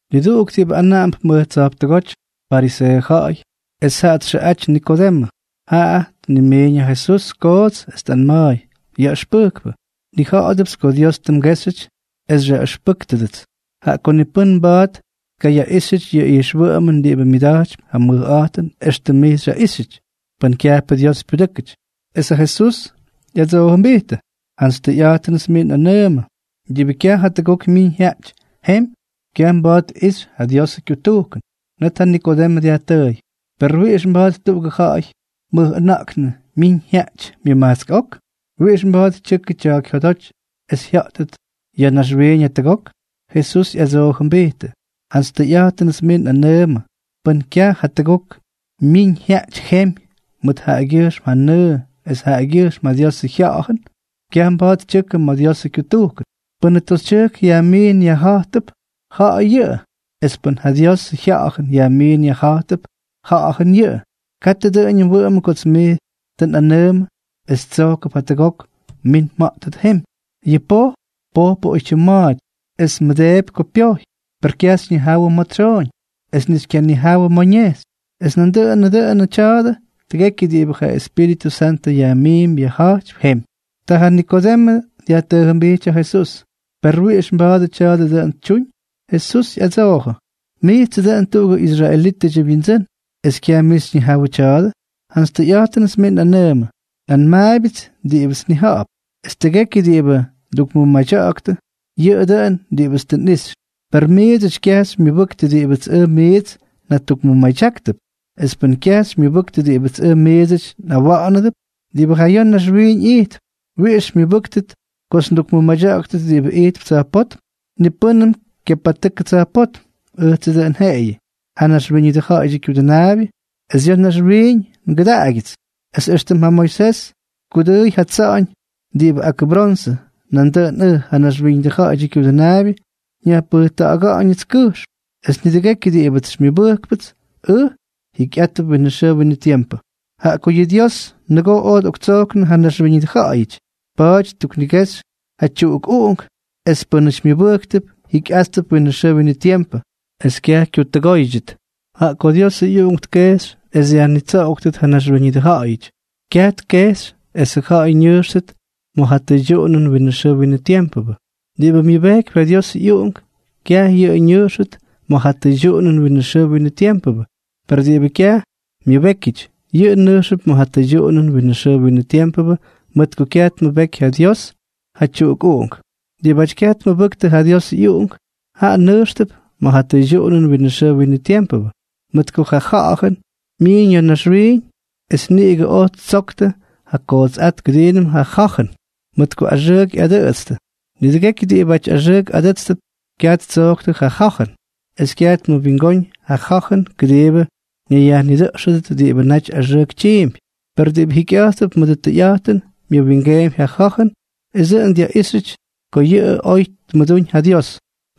Niduꞌuk diꞌibʉ anaꞌamp mʉj tsa̱jptʉgóty, fariseeʉ ja̱ꞌa̱y, es jaꞌa txʉꞌaty Nikodemʉ, jaꞌa ñimiin ja Jesús koots, es tꞌanma̱a̱y: —Yaꞌʉxpʉjkpʉ, nnija̱ꞌa̱dʉpts ko Dios tʉ mgéxyʉty es xyaꞌʉxpʉ́ktʉdʉts, jaꞌa ko ni pʉ́n mba̱a̱t tkayaꞌíxyʉty yʉ ijxwʉꞌʉmʉn diꞌibʉ myʉda̱jtypy ja mʉjꞌa̱jtʉn éxtʉm mij xyaꞌíxyʉty, pʉn kyajpʉ Dios pyudʉ́kʉty. Es ja Jesús ꞌyadsoojʉmbijtʉ: —Jantsy tʉyꞌa̱jtʉnʉts mij nꞌanʉʉmʉ, diꞌibʉ kyaj jatʉgok myiñ jyaꞌty jemy, kyaj mba̱a̱t tꞌixy ja Diosʉ kyutujkʉn. Net ja Nikodemʉ dyajtʉʉy: —¿Per wiꞌix mba̱a̱t tuꞌugʉ ja̱ꞌa̱y mʉjꞌʉna̱ꞌknʉ myiñ jyaꞌty myʉmajtsk ok? ¿Wiꞌix mba̱a̱t tyʉkʉ tya̱a̱k jyodoty es jya̱ꞌtʉt ya̱ naxwiiñ jatʉgok? Jesús ꞌyadsoojʉmbijtʉ: —Jantsy tʉyꞌa̱jtʉnʉts mij nꞌanʉʉmʉ, pʉ́n kyaj jatʉgok myiñ jyaꞌty jemy mʉt jaꞌagyʉjxm ja nʉʉ es jaꞌagyʉjxm ja Diosʉ Jya̱ꞌa̱jʉn, kyaj mba̱a̱t tyʉkʉ ma̱ Diosʉ kyutujkʉn. Pʉ́nʉ toxytyʉjk yajmiin yajja̱jtʉp, ja̱ꞌa̱y yʉꞌʉ; es pʉ́n ja Diosʉ Jya̱ꞌa̱jʉn yajmiin yajja̱jtʉp, ja̱ꞌa̱jʉn yʉꞌʉ. Katʉ dʉꞌʉñʉ mwʉꞌʉmʉ kots mij tʉ nꞌanʉʉmʉ es tsojkʉp jatʉgok mmin mja̱ꞌttʉt jemy. Yʉ poj, pojpʉꞌʉ oytyim ma̱a̱ty, es mmʉdeepy ko pyojy, per kyaj xyñijawʉ ma̱ tsyooñ es ni xykyanijawʉ ma̱ ñejxy. Es nandʉꞌʉnʉ dʉnʉ tya̱a̱dʉ tʉgekyʉ diꞌibʉ ja Espíritʉ Santʉ yajmiimpy yajja̱jtypy jemy. Ta ja Nikodemʉ dyajtʉʉjʉmbijty ja Jesús: —¿Per wiꞌix mba̱a̱dʉ tya̱a̱dʉ dʉꞌʉn tyuñ? Jesús ꞌyadsoojʉ: —Mijtsʉ dʉꞌʉn tuꞌugʉ israelítʉdyʉ wyindsʉ́n, ¿es kyaj mij xyñijawʉ tya̱a̱dʉ? Jantsy tʉyꞌa̱jtʉnʉts mij nꞌanʉʉmʉ, nꞌanmaabyʉts diꞌibʉts nnija̱ꞌa̱p. Es tʉgekyʉ diꞌibʉ tʉ ndukmʉmadya̱ꞌa̱ktʉ, yʉꞌʉ dʉn diꞌibʉts tʉ nꞌixy. Per miidsʉty kyaj xymyʉbʉktʉ diꞌibʉts ʉj miits njatukmʉmadyáktʉp. Es pʉn kyaj xymyʉbʉktʉ diꞌibʉts ʉj miidsʉty njaꞌꞌawa̱ꞌa̱nʉp diꞌibʉ ja ya̱ naxwiiñ ijtp, ¿wiꞌix xymyʉbʉ́ktʉt kots ndukmʉmadya̱ꞌa̱ktʉt diꞌibʉ ijtp tsa̱jpótm? ’Ni pʉ́nʉm kyapatʉkʉ tsa̱jpótm, ʉjtsʉ dʉꞌʉn jeꞌeyʉ, ja Naxwíñʉdʉ Ja̱ꞌa̱yʉdyʉ Kyudʉnaabyʉ, es ya̱ naxwiiñ ngʉdaꞌagyʉts. Es éxtʉm ja Moisés tkudʉʉy ja tsa̱ꞌa̱ñ diꞌibʉ ak bronsʉ, nandʉꞌʉn ʉj, ja Naxwíñʉdʉ Ja̱ꞌa̱yʉdyʉ Kyudʉnaabyʉ, nyajpʉjta̱ꞌa̱ga̱ꞌa̱ñʉts kʉjxm. Es nidʉgekyʉ diꞌibʉts xymyʉbʉjkpʉts ʉj, jikyꞌátʉp winʉ xʉʉ winʉ tiempʉ. Jaꞌa ko yʉ Dios nʉgoo oj tꞌoktsojknʉ ja naxwíñʉdʉ ja̱ꞌa̱yʉty, pa̱a̱ty ttuknigejxy ja tyuꞌukꞌUꞌunk, es pʉnaty myʉbʉjktʉp jikyꞌáttʉp winʉ xʉʉ winʉ tiempʉ es kyaj kyutʉgóydyʉt. Jaꞌa ko Diosʉ ꞌyUꞌunk tkejxy es dyajnitsoꞌoktʉt ja naxwíñʉdʉ ja̱ꞌa̱yʉty, kyaj tkejxy esʉ ja̱ꞌa̱y ñʉjxtʉt ma̱ ja tʉydyuꞌunʉn winʉ xʉʉ winʉ tiempʉ. Diꞌibʉ myʉbejkypy ja Diosʉ ꞌyUꞌunk, kyaj yʉꞌʉ ñʉjxʉt ma̱ ja tʉydyuꞌunʉn winʉ xʉʉ winʉ tiempʉ, per diꞌibʉ kyaj myʉbékyʉty, yʉꞌʉ nʉjxʉp ma̱ ja tʉydyuꞌunʉn winʉ xʉʉ winʉ tiempʉ mʉt ko kyaj tmʉbeky ja Dios ja tyuꞌukꞌUꞌunk. Diꞌibáty kyaj tmʉbʉktʉ ja Diosʉ ꞌyUꞌunk, jaꞌa nʉjxtʉp ma̱ ja tʉydyuꞌunʉn winʉ xʉʉ winʉ tiempʉ, mʉt ko ja ja̱jʉn myiiñ ya̱ naxwiiñ, es niꞌigʉ oj ttsoktʉ ja kootsꞌát kʉdiinʉm ja ja̱jʉn, mʉt ko axʉʉk ꞌyadʉꞌʉtstʉ. Nidʉgekyʉ diꞌibáty axʉʉk adʉ́tstʉp, kyaj ttsoktʉ ja ja̱jʉn, es kyaj tmʉwingóñ ja ja̱jʉn kʉdiibʉ ñayyajnidʉꞌxʉdʉt diꞌibʉ naty axʉʉk tyiimpy. Per diꞌibʉ jikyꞌa̱jttʉp mʉdʉ tʉyꞌa̱jtʉn, myʉwingeempy ja ja̱jʉn es dʉꞌʉn dyaꞌíxyʉty ko yʉꞌʉ oy tmʉdúñ ja Dios.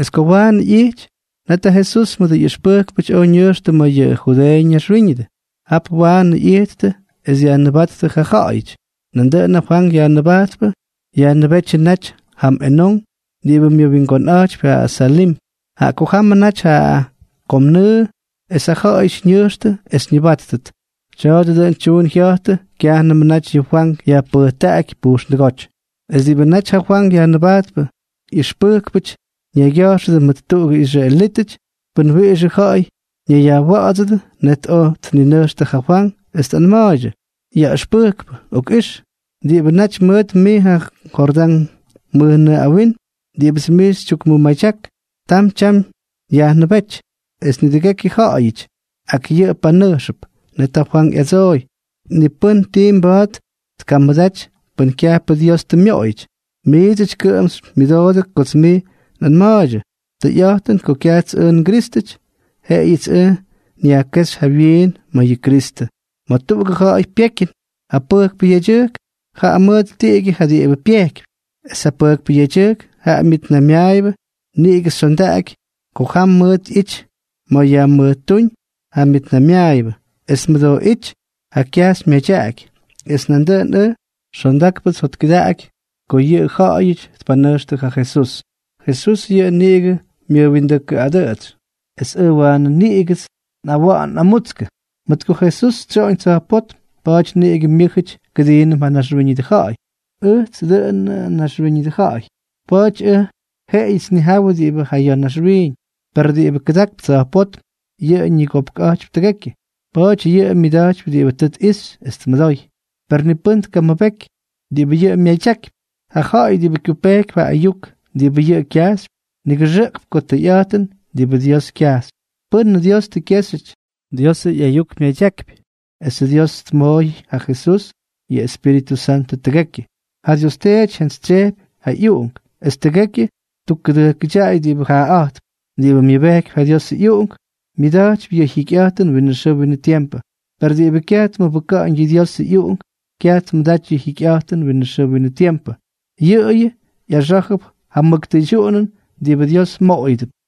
Es ko waanʉ ꞌyijty, net ja Jesús mʉdʉ ꞌyʉxpʉjkpʉty oj ñʉjxtʉ ma̱ yʉ Judeeʉ ñaxwíñʉdʉ. Jap waanʉ ꞌyijttʉ es dyajnʉbáttʉ ja ja̱ꞌa̱yʉty. Nandʉꞌʉn ja Fwank Yajnʉbajtpʉ yajnʉbétyʉ naty jam Enón diꞌibʉ myʉwingonꞌa̱jtypy ja Salim, jaꞌa ko jamʉ naty ja kom nʉʉ, es ja ja̱ꞌa̱yʉty ñʉjxtʉ es ñʉbáttʉt. Tya̱a̱dʉ dʉꞌʉn tyuun jya̱jtʉ kyajnʉmʉ naty yʉ Fwank yajpʉjtaꞌaky pujxndʉgóty. Es diꞌibʉ naty ja Fwank Yajnʉbajtpʉ ꞌyʉxpʉjkpʉty ñaygya̱jxʉdʉ mʉt tuꞌugʉ israelítʉty pʉn wiꞌixʉ ja̱ꞌa̱y ñayyajwa̱ꞌa̱dsʉdʉ. Net oj tninʉjxtʉ ja Fwank es tꞌanma̱a̱ydyʉ: —Yaꞌʉxpʉjkpʉ, okꞌix. Diꞌibʉ naty mʉt mij ma̱ Jordán mʉjnʉʉ awinm, diꞌibʉts mij xytyukmʉmadyak, tam tyam yajnʉbéty, es nidʉgekyʉ ja̱ꞌa̱yʉty ak yʉꞌʉ panʉjxʉp. Net ja Fwank ꞌyadsooy: —Ni pʉ́n tii mba̱a̱t tkamʉdaty pʉn kyajpʉ Dios tʉ myoꞌoyʉty. Miidsʉty kʉꞌʉm xymyʉdoodʉ kots miits nꞌanma̱a̱ydyʉ: “Tʉyꞌa̱jtʉn ko kyajts ʉj nGrístʉty, jeꞌeyʉts ʉj nyajkéxy jawyiin ma̱ yʉ Kristʉ.” Ma̱ tuꞌugʉ ja̱ꞌa̱y pyekyʉn, ja pʉjkpʉ yedyʉjk jaꞌa mʉt tiꞌigyʉ ja diꞌibʉ pyejkypy. Es ja pʉjkpʉ yedyʉjk ja myʉtnaymyaayʉbʉ niꞌigʉ xyondaꞌaky ko jam mʉʉt ꞌyity ma̱ yajmʉjtúñ ja myʉtnaymyaayʉbʉ es tmʉdooꞌíty ja kyajxy myadyaꞌaky. Es nandʉꞌʉn ʉj, xondákpʉts jotkʉdaꞌaky ko yʉ ja̱ꞌa̱yʉty tpanʉjxtʉ ja Jesús. Jesús yʉꞌʉ niꞌigʉ myʉjwiindʉjkʉꞌadʉꞌʉtsy, es ʉj waanʉ niꞌigʉts nꞌawaan nꞌamutskʉ. Mʉt ko Jesús tsyoꞌoñ tsa̱jpótm, pa̱a̱ty niꞌigʉ myʉ́jʉty kʉdiinʉm ja naxwíñʉdʉ ja̱ꞌa̱y. Ʉjtsʉ dʉꞌʉnʉ naxwíñʉdʉ ja̱ꞌa̱y. Pa̱a̱ty ʉj jeꞌeyʉts nnijawʉ diꞌibʉ ja ya̱ naxwiiñ. Per diꞌibʉ kʉdakp tsa̱jpótm, yʉꞌʉ ñigopkꞌa̱jtypy tʉgekyʉ. Pa̱a̱ty yʉꞌʉ myadyakypy diꞌibʉ tʉ tꞌixy es tmʉdoy, per ni pʉ́n tkamʉbeky diꞌibʉ yʉꞌʉ myadyakypy. Ja ja̱ꞌa̱y diꞌibʉ kyupejkypy ja ayuk diꞌibʉ yʉꞌʉ kyajxypy, nigʉxʉꞌkp ko tʉyꞌa̱jtʉn diꞌibʉ Dios kyajxypy. Pʉ́nʉ Dios tʉ kyéxyʉty, Diosʉ ꞌyayuk myadyakypy. Esʉ Dios tmooy ja Jesús yʉ Espíritʉ Santʉ tʉgekyʉ. Ja Dios Teety jyantsytsyejpy ja ꞌyUꞌunk, es tʉgekyʉ ttukkʉdʉjkʉdyaꞌay diꞌibʉ jaaꞌa̱jtp. Diꞌibʉ myʉbejkypy ja Diosʉ ꞌyUꞌunk, myʉda̱jtypy yʉ jikyꞌa̱jtʉn winʉ xʉʉ winʉ tiempʉ; per diꞌibʉ kyaj tmʉbʉka̱ꞌa̱ñ yʉ Diosʉ ꞌyUꞌunk, kyaj tmʉdaty ja jikyꞌa̱jtʉn winʉ xʉʉ winʉ tiempʉ, yʉꞌʉyʉ ꞌyaxá̱jʉp ja mʉk tʉydyuꞌunʉn diꞌibʉ Dios moꞌoyʉdʉp.